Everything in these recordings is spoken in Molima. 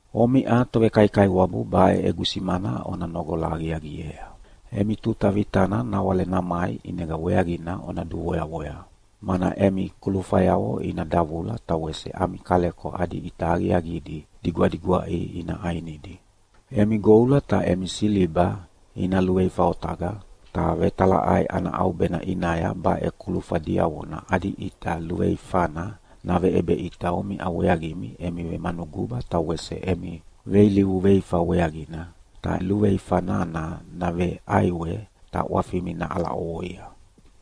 Omiʼa tovekaikaiwabu baʼe egu simana ona noqola aqiaqiea. Emi tuta vitana nawale namai ʼinega weaqina ona duvoyavoya, mana emi kulufayavo ina davula ta wese ami kaleko adi ʼita aqiaqidi digwadigwaʼi ina ʼainidi. Emi goula ta emi siliba ina luveifa otaqa, ta vetalaʼai ana ʼaubena ʼinaya baʼe kulufa diavona adi ʼita luveifana naveʼebeʼita omiʼa weaqimi emi vemanuguba ta wese emi veilivu veifa weaqina, ta luveifa nana naveʼaiwe ta ʼwafimi naʼala ʼovoia.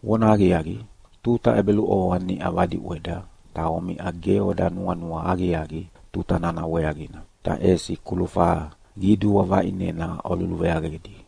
Vonahaqiaqi, tuta ʼebeluʼovoa niʼa vadiʼweda ta omiʼa ge oda nuanua aqiaqi tuta nana weaqina, ta ʼesi kulufa qidua vaʼinena oluluveaqedi.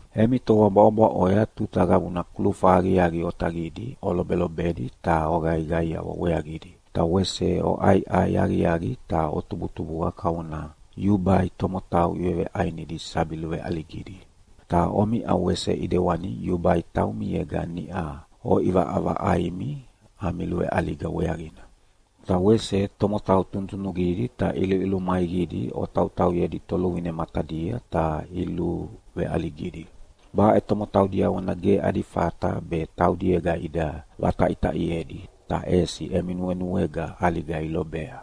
Emi toa bwaʼobwaʼoya tuta qabuna kulufa aqiaqi otaqidi olobelobedi ta oqaiqaiawa weaqidi, ta wese oʼaiʼai aqiaqi ta otubutubuqa kavona yubai tomotau iveveʼainidi sabi luveʼaligidi. Ta omiʼa wese ʼidewani yubai taumiega niʼa oʼivaʼavaʼaimi ami luveʼaliga weaqina. Ta wese tomotau tunutunuqidi ta ʼiluʼilumaiqidi otauyedi toluvine matadia ta iluveʼaligidi. Baʼe tomotau diavona ge adi fata be taudiega ida vataʼitaʼiedi, ta ʼesi emi nuenuega ʼaliga ilobea.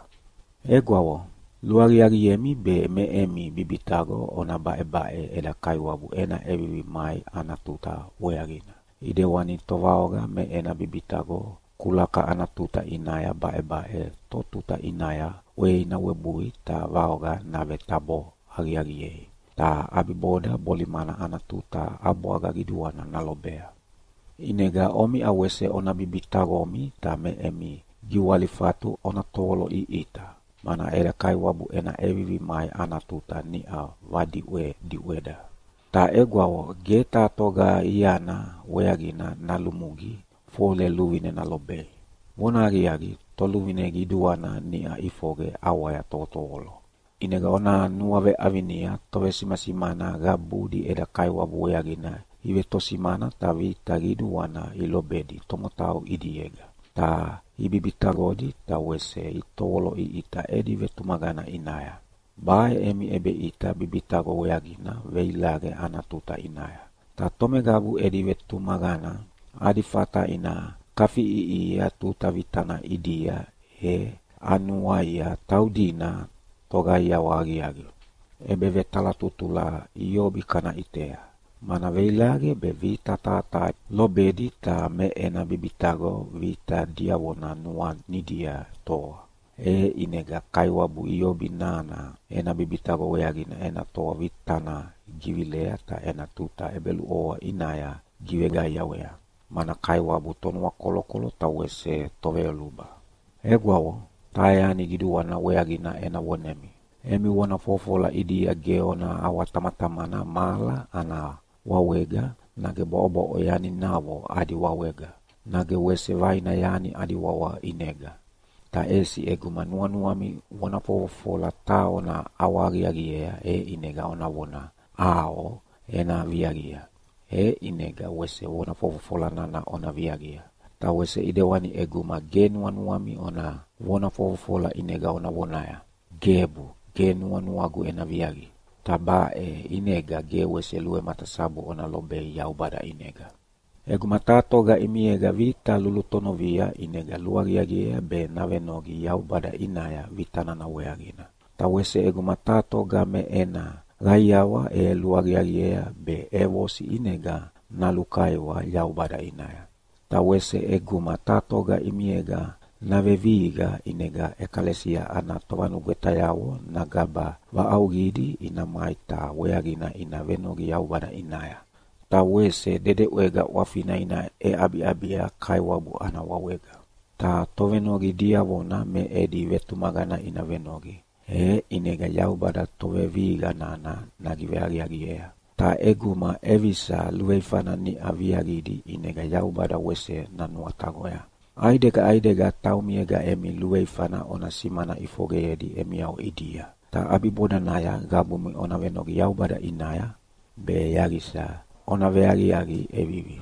Egwavo, luaqiaqiemi be me emi bibitaqo ona baʼebaʼe eda Kaiwabu ena ʼevivi mai ana tuta weaqina, ʼidewani tovaoqa me ena bibitaqo kulaka ana tuta ʼinaya baʼebaʼe totuta ʼinaya ʼwei nawebui ta vaoqa navetabo aqiaqiei, ta ʼabiboda bolimana ana tutaya ʼabwaga qiduana nalobea. ʼInega omiʼa wese ona bibitaqomi ta me emi giwalifatu ona tovoloʼiʼita, mana eda Kaiwabu ena ʼevivi mai ana tuta niʼa vadiʼwediʼweda. Ta egwavo, ge taha toga iana weaqina nalumugi fole luvine nalobei. Vonahaqiaqi, Toluvine Qiduana niʼa ʼifoqe ʼawaya tovotovolo. ʼInega ona nuaveʼavinia tovesimasimana qabudi eda Kaiwabu weaqina ivetosimana ta vita qiduana ilobedi tomotau ʼidiega, ta ibibitaqodi ta wese itovoloʼiʼita edi vetumaqana ʼinaya. Baʼe emi ʼebeʼita bibitaqo weaqina veilaqe ana tuta ʼinaya. Ta tomeqabu edi vetumaqana adi fata ina kafiʼiʼihia tuta vitana ʼidia e anuaia taudina toqaiawa aqiaqi. ʼEbevetalatutula Iobi kana ʼitea, mana veilaqe be vita taha taha lobedi ta me ena bibitaqo vita diavona nuanidia toa. E ʼinega Kaiwabu Iobi nana ena bibitaqo weaqina ena toa vitana givilea ta ena tuta ʼebeluʼovoa ʼinaya giveqaiawea, mana Kaiwabu Tonuakolokolo ta wese Toveyoluba. Egwavo, taha yani qiduana weaqina ena vonemi. Emi vona fofofola ʼidia ge ona ʼawatamatamana mahala ana wawega, nage bwaʼobwaʼo yaninavo adi wawega, nage wese vaina yani adi wawa ʼinega! Ta ʼesi ʼeguma nuanuami vona fofofola taha ona ʼawahaqaqiea ʼinega ona vona, “ʼAo ena viaqia!” E ʼinega wese vona fofofola nana ona viaqia. Ta wese ʼidewani ʼeguma ge nuanuami ona vona fofofola ʼinega ona vonaya, “Gebu, ge nuanuagu ena viaqi!” Ta baʼe ʼinega ge wese luvematasabu ona lobei Yaubada ʼinega. ʼEguma taha toga ʼimiega vita lulutonovia ʼinega luaqiaqiea be navenoqi Yaubada ʼinaya vita nana weaqina. Ta wese ʼeguma taha toga me ena qaiawa e luaqiaqiea be ʼevosi ʼinega nalukaiwa Yaubada ʼinaya. Ta wese ʼeguma taha toga ʼimiega navevihiqa ʼinega ʼekalesia ana tovanugwetayavo nagaba vaʼauqidi ina mai ta weaqina ina venoqi Yaubada ʼinaya, ta wese dedeʼwega ʼwafina ina ʼeʼabiʼabia Kaiwabu ana wawega. Ta tovenoqi diavona me edi vetumaqana ina venoqi, e ʼinega Yaubada tovevihiqa nana nagiveaqiaqiea. Ta ʼeguma ʼevisa luveifana niʼa viaqidi ʼinega Yaubada wese nanuataqoya. ʼAidega ʼaidega taumiega emi luveifana ona simana ʼifoqeyedi emiavo ʼidia, ta ʼabibodanaya qabumi ona venoqi Yaubada ʼinaya be yaqisa ona veaqiaqi ʼevivi.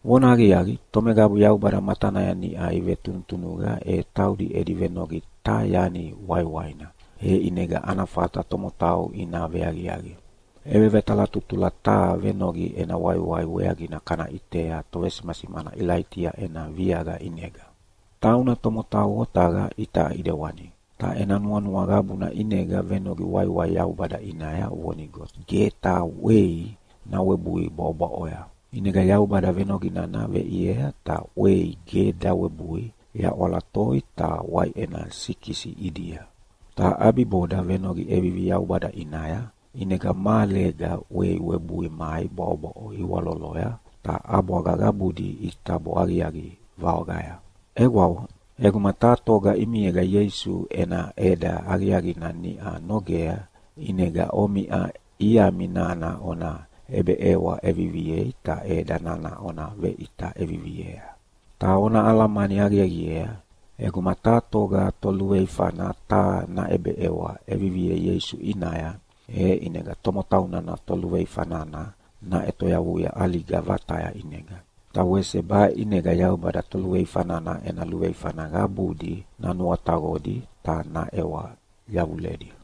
Vonahaqiaqi, tomeqabu Yaubada matanaya niʼa ivetunutunuqa e taudi edi venoqi taha yani waiwaina, e ʼinega ana fata tomotau ina veaqiaqi. ʼEbevetalatutula taha venoqi ena waiwai weaqina kana ʼitea tovesimasimana Ilaitia ena viaqa ʼinega. Tauna tomotau otaqa itaʼa ʼidewani, ta ena nuanua qabuna ʼinega venoqi waiwai Yaubada ʼinaya vonigo ge taha ʼwei nawebui bwaʼobwaʼoya. ʼInega Yaubada venoqi nana veʼiea ta ʼwei ge dawebui yaʼwala toi ta waiʼena sikisi ʼidia. Ta ʼabiboda venoqi ʼevivi Yaubada ʼinaya, ʼinega mahalega ʼwei webui mai bwaʼobwaʼo iwaloloya ta ʼabwaga qabudi itabo aqiaqi vaoqaya. Egwavo, ʼeguma taha toga ʼimiega Ieisu ena ʼeda aqiaqina niʼa nogea, ʼinega omiʼa iami nana ona ʼebeʼewa ʼeviviei ta ʼeda nana ona veʼita ʼeviviea. Ta ona alamani aqiaqiea, ʼeguma taha toga toluveifana taha naʼebeʼewa ʼeviviea Ieisu ʼinaya, e ʼinega tomotau nana toluveifa nana naʼetoyavuia ʼaliga vataya ʼinega. Ta wese baʼe ʼinega Yaubada toluveifa nana ena luveifana qabudi nanuataqodi ta naʼewa yavuledi.